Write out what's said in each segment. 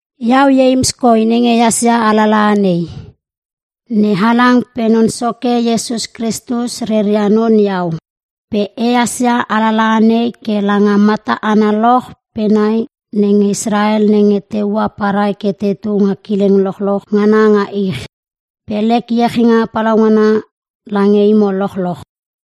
Iau Ieims koi nenge ehas ia alalaha nei. NeHalang pe Non Soke Iesus Kristus reia non iau. Pe ehas ia alalaha nei ke lange mata analoch pe nai nenge Israel nenge te ua parai ke tetu nga kileng lochloch ngana nga ich. Pe lek iechinga palaungana lange imo lochloch.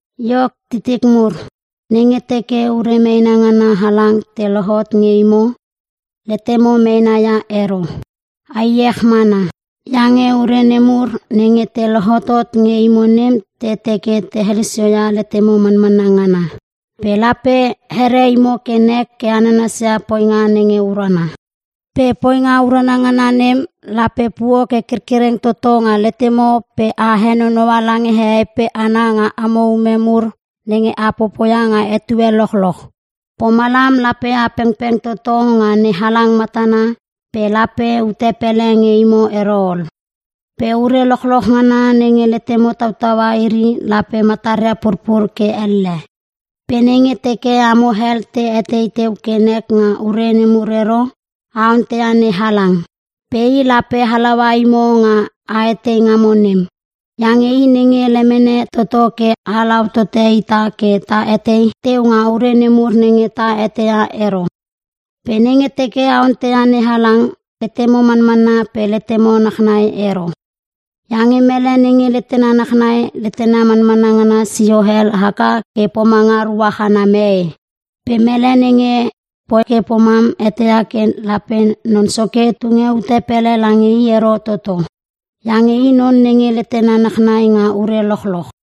Iok titik mur, nenge teke ure meena ngana halang te lohot nge imo, letemo meena ia ero. A iech mana. Iange ure nemur nenge te lohotot nge imo nem te teke te helosio ia letemo manmanna ngana. Pe lape here imo ke nek ke a nanasia poinga nge urana. Pe poinga urana ngana nem, lape puo ke kerkereng toto nga letemo pe a henonoua lange hehei pe hana nga amo ume mur nenge a popoia nga etue lochloch. Pomalam lape a pengpeng toto nga NeHalang matana pe lape ute pele nge imo ero ol. Pe ure lochloch ngana nenge letemo tautaua iri lape mataria purpur ke elle. Pe nenge teke amo hel te etei teu ke nek nga ure nemur ero, a onteia NeHalang. Pe i lape halaua imo nga a etei ngamo nem. Iange i nge lemene toto ke halau tote ita ke ta etei teu nga ure mur nenge ta etei ia ero. Pe nenge teke a onteia NeHalang, letemo manmanna pe letemo nachnai ero. Iange mele nenge letena nachnai, letena manmanna ngana sio hel haka ke pomanga ruach ana mee. Pe mele nenge poi ke pomam eteia ke lape Non Soke tunge ute pele lange i ero toto. Iange i non nenge letena nachnai nga ure lochloch.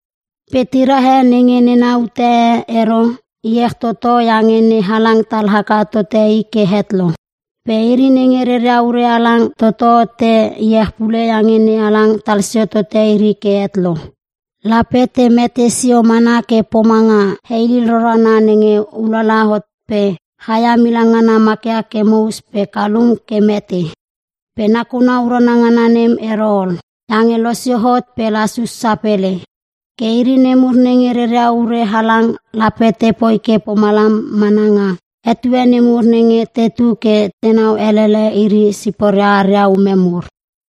Pe tira e nenge nena ute e ero, iech toto iange NeHalang tal haka tote i ke het lo. Pe iri nenge reria ure halang toto te iech pule iange NeHalang tal sio tote iri ke het lo. Lape te mete sio mana ke pomanga heilil rorana nenge ulala hot pe chaia milang ngana makia ke mous pe kalum ke mete. Pe nakuna urana ngana nem ero ol, iange losio hot pe lasus sapele. Ke iri nemur nenge reria ure halang lape te poi ke pomalam mana nga etue nemur nenge tetu ke tenau elele iri siporia aria ume mur.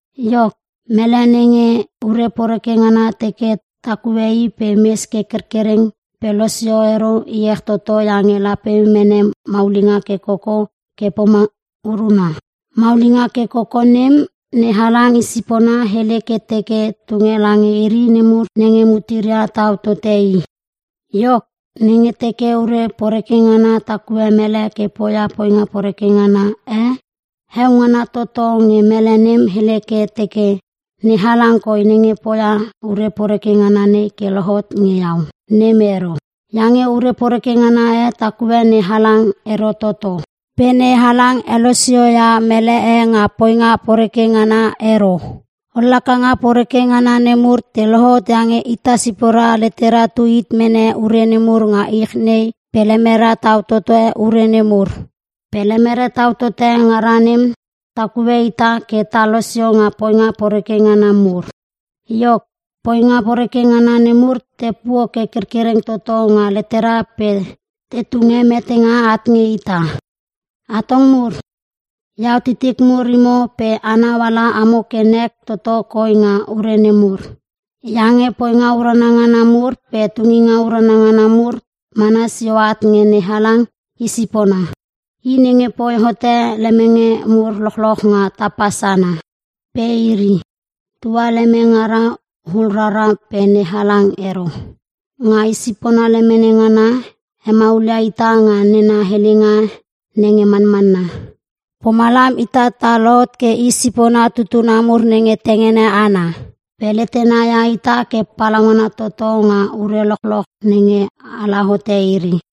Iok, mele nenge ure poreke ngana teke takue i pe mes ke kerkereng pe losio ero, iech toto iange lape mene maulinga ke koko ke pomanga uruna. Maulinga ke koko nem, NeHalang i sipona hele ke teke tunge lange iri nemur nenge muteria tau tote i. Iok, nenge teke ure poreke ngana takue mele ke poia poinga poreke ngana e, heo ngana toto nge mele nem hele ke teke, “NeHalang koi nenge poia ure poreke ngana nei ke lohot nge iau.” Nem ero. Iange ure poreke ngana e takue NeHalang ero toto. Pe NeHalang helosio ia mele e nga poinga poreke ngana ero. Ollakanga poreke ngana nemur te lohot iange ita sipora letera tu hit mene ure nemur nga ich nei pe lemere tau tote ure nemur. Pe lemere tau toto ngara nem takue ita ke ta losio nga poinga poreke ngana mur. Iok, poinga poreke ngana nemur te puo ke kerkereng toto nga letera pe te tunge metenga at nge ita. Atong mur! Iau titik mur imo pe anau ala amo ke nek toto koi nga ure nemur. Iange poinga urana ngana mur pe tunginga urana ngana mur mana sio at nge NeHalang i sipona. I nge poi hote lemenge mur lochloch nga tapa sana. Pe iri, tua leme ngaria hul rarara, pe NeHalang ero. Nga i sipona lemene ngana, hemaulia ita nga nena helenga nenge manmanna. Pomalam ita ta lohot ke i sipona tutuna mur nenge tengene ana. Pe letena ia ita ke palaungana toto nga ure lochloch nenge ala hote iri.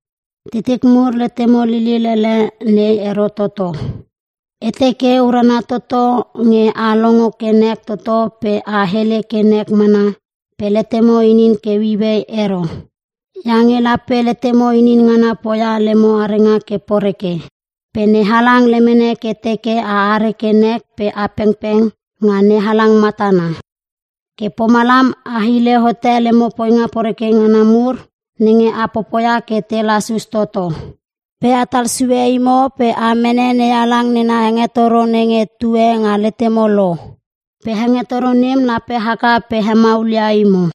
Titik mur letemo lilil ele nei ero toto. E teke urana toto nge a longo ke nek toto pe a hele ke nek mana pe letemo inin ke ueiuei ero. Iange lape letemo inin ngana poia lemo arenga ke poreke. Pe NeHalang lemene ke teke a are ke nek pe a pengpeng nga NeHalang matana. Ke pomalam a hile hote lemo poinga poreke ngana mur nenge a popoia ke te lasus toto. Pe atal sue imo pe a mene NeHalang nena hengetoro nenge tue nga letemo lo. Pe hengetoro nem lape haka pe hemaulia imo.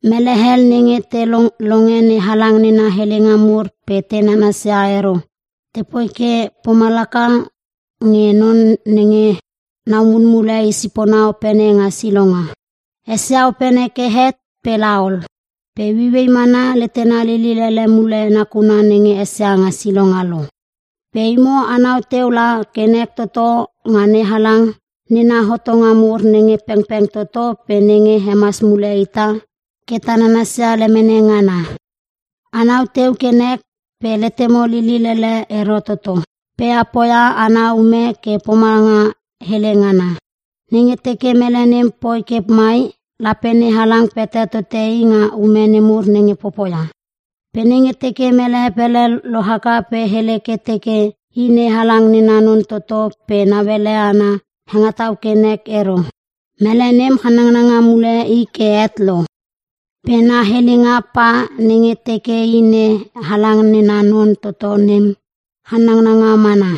Mele hel nenge te longe NeHalang nena helenga mur pe te nanasia iri ero, tepoi ke pomalaka nge non nenge nau mulmule i sipona opene nga silonga. Esia opene ke het pe laol. Pe ueiuei mana letena lilil ele mule nakuna nenge esia nga silonga lo. Pe imo anau teu la ke nek toto nga NeHalang nena hotonga mur nenge pengpeng toto pe nenge hemas mule ita ke ta nanasia lemene ngana. Anau teu ke nek pe letemo lilil ele ero toto. Pe a poia ana ume ke pomanga hele ngana. Nenge teke mele nem poi ke mai, lape NeHalang pete tote i nga ume nemur nenge popoia. Pe nenge teke mele pele lohaka pe hele ke teke i NeHalang nena non toto pe nauele ana hengetau ke nek ero, mele nem channanga mule i ke het lo. Pe na helenga pa nenge teke i NeHalang nena non toto nem, channanga mana.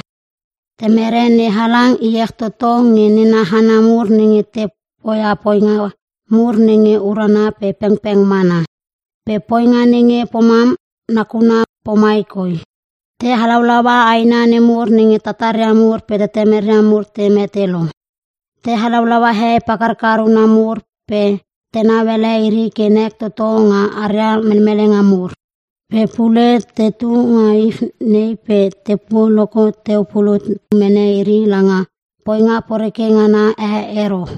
Temere NeHalang iech toto nge nena hana mur nenge te poia poinga mur nenge urana pe pengpeng mana. Pe poinga nenge pomam nakuna pomai koi: Te halaulaua aina nemur nenge tataria mur pe tetemeria mur te mete lo. Te halaulaua hehei pakarkar una mur pe tenau ele iri ke nek toto nga aria melmelenga mur. Pe pule tetu nga ich nei pe tepuo loko teu pulut teu mene iri langa poinga poreke ngana e ero.